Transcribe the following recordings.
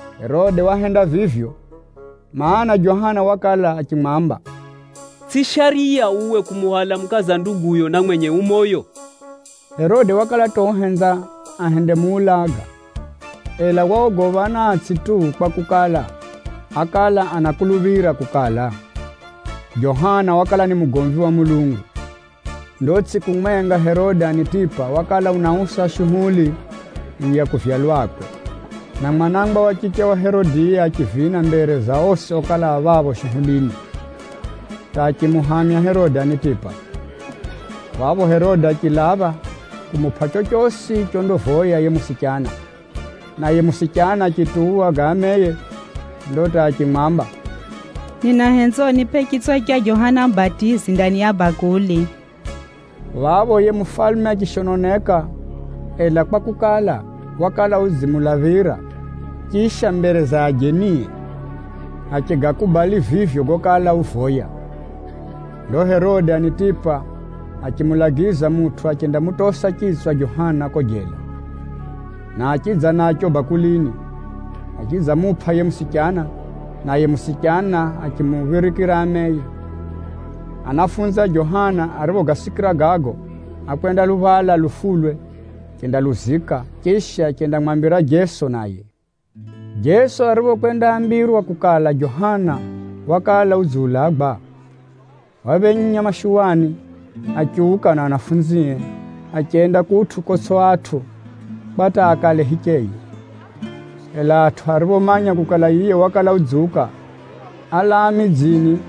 Herode wahenda vivyo, mana, Johana wakala achimwamba, “Tsʼiyo shariya uwe kumuhwala mukaza nduguyo na mwenye ucheri moyo!” Herode wakala hata uhenza ahendemuulaga, ela waogopha anatsʼi tu kwakukala, ákala anakuluphira kukala, Johana wakala ni mugomvi wa Mulungu. Ndo tsʼiku mwenga, Herode Anitipa wakala unausa shuhuli ya kuvyalwakwe, na mwana wa chiche wa Herodiya achivina mbere za osi okala a phapho shuhulini, hata achimuhamya Herode Anitipa. Phapho Herode achilapha kumupʼa chochosi chondavoya yiye musichana. Naye musichana achituwa ga ameye, ndo hata achimwamba, “Ninahenza unipʼe chitswa cha Johana Mubatizi ndani ya bakuli.” Phapho yiye mufalume achishononeka, ela kwakukala, wakala udzimulaphira, chisha mbere za ajenie, achigakubali vivyo gokala uvoya. Ndo Herode Anitipa achimulagiza mutʼu achendamutosa chitswa Johana kuko jela, na achidza nacho bakulini, achidzamupʼa yiye musichana, naye musichana achimuphirikira ameye. Anafunzi a Johana ariphogasikira gago, ákwendaluhwala lufulwe achendaluzika. Chisha achendamwambira Jeso naye. Jeso ariphokwendaambirwa kukala Johana wakala udziulagwa, waphenya mashuwani achiuka na anafunzie, achenda kutʼu kotsʼi atʼu kwa hata akale hicheye. Ela atʼu ariphomanya kukala yiye wakala udziuka, álaa midzini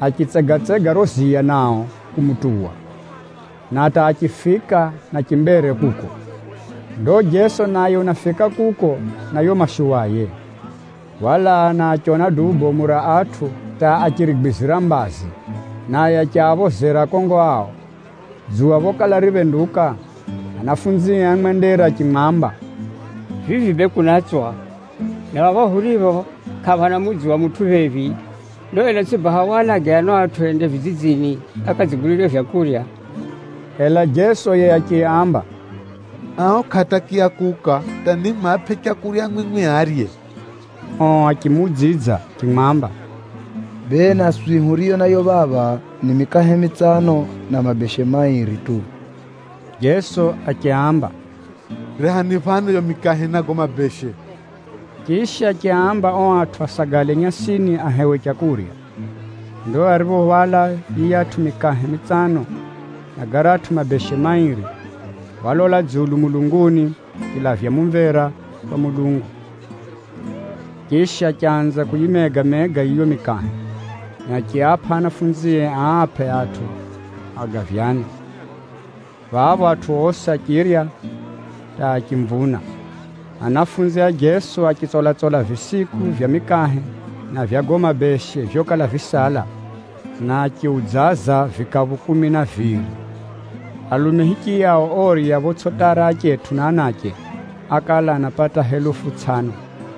achitsegatsega riro ziya nao kumutuwa, na hata achifika na chimbere kuko. Ndo Jeso naye unafika kuko na yiyo mashuwaye, walaa na achiona duu bomu ra atʼu hata achirigwizira mbazi, naye achiaphozera akongo ao. Dzuwa phokala riphenduka, anafunzie ámwendera achimwamba, “Vivi bee kunatswa, na phapha huripho kʼaphana mudzi wa mutʼu phephi. Ndo ela tsʼi baha walage ano atʼu ende vidzidzini akadzigulire vyakurya?” Ela Jeso yiye achiaamba, “Ao kʼaatakiya kuuka, hata nimwapʼe leu mwimwi arye.” Ao achimuudzidza achimwamba, “Bee naswi huriyo nayo phapha ni mikahe mitsano, na mabeshe mairi tu.” Jeso achiaamba, “Rehani phano yiyo mikahe na gago mabeshe.” Chisha, achiaamba ao atʼu asagale nyasini ahewe leu. Ndo ariphohwala yiyatʼu mikahe mitsano na garatʼu mabeshe mairi, walola dzulu mulunguni achilavya mumvera kwa Mulungu, chisha achanza kuyimega-mega yiyo mikahe, na achiapʼa anafunzie aapʼe atʼu agavyane. Phapho atʼu osi achirya hata achimvuna. Anafunzi a Jeso achitsola-tsola visiku vya mikahe na vya gago mabeshe vyokala visala, na achiudzaza vikaphu kumi na viri. Alume hichiyao orya photsʼiatara achetʼu na anache, ákala anapata helufu tsʼano.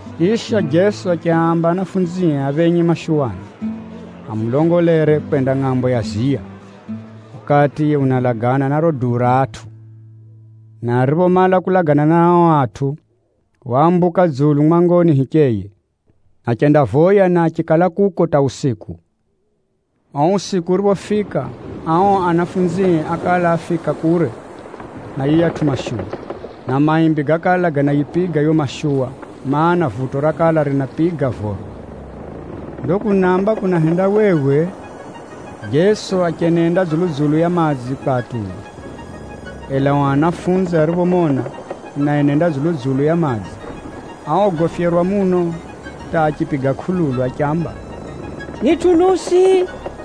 Chisha, Jeso achiaamba anafunzie aphenye mashuwani, amulongolere kwenda ngʼambo ya ziya, ukati yiye unalagana na riro duu ra atʼu. Na ariphomala kulagana na ao atʼu, waambuka dzulu mwangoni hicheye, achendavoya na achikala kuko hata usiku. Uo usiku uriphofika, ao anafunzie ákala afika kure na yiyatʼu mashuwa, na maimbi gákala ganayipiga yiyo mashuwa, mana, vuto rakala rinapiga voro. Ndo kunamba kunahendawewe, Jeso achenenda dzulu-dzulu ya madzi kwatuwa. Ela ao anafunzi ariphomona unaenenda dzulu-dzulu ya madzi, áogofyerwa muno hata achipiga kʼululu achiamba, “Ni tunusi!”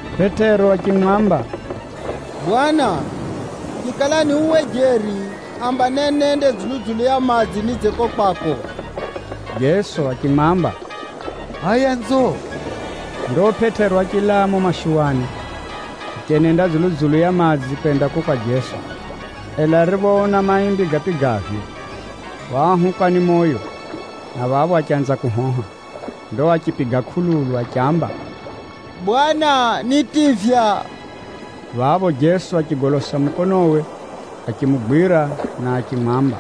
Pʼetero achimwamba, “Bwana, chikala ni uwe jeri, namba nenende dzulu-dzulu ya madzi nidze kuko kwako.” Jeso achimwamba, “Hʼaya nzo.” Ndo Pʼetero achilaa mumo mashuwani, achenenda dzulu-dzulu ya madzi kwenda kuko kwa Jeso. Ela ariphoona maimbi gapigavyo, waahukwa ni moyo, na phapho achanza kuhoha. Ndo achipiga kʼululu achiamba, “Bwana, nitivya!” Phapho Jeso achigolosa mukonowe, achimugwira na achimwamba,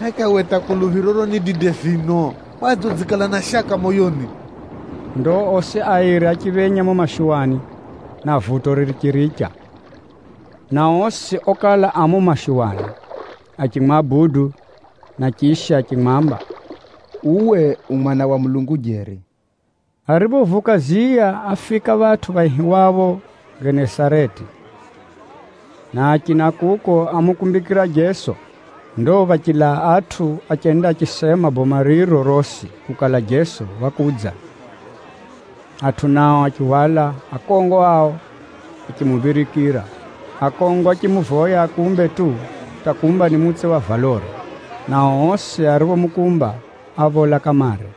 “Heka uwe hata kuluphiroro ni dide vino! Kwadze udzikala na shaka moyoni?” Ndo osi airi achiphenya mumo mashuwani, na vuto richiricha. Na osi okala a mumo mashuwani achimwabudu, na chisha achimwamba, “Uwe u Mwana wa Mulungu jeri!” Ariphovuka ziya, áfika phatʼu phaihiwapho Genesareti, na achina kuko ámukumbikira Jeso. Ndo phachilaa atʼu achenda achisema boma riro rosi kukala Jeso wakudza. Atʼu nao achihwala akongo ao achimuphirikira. Akongo achimuvoya akumbe tu hata kumba ni mutse wa valore, nao osi ariomukumba, áphola kamare.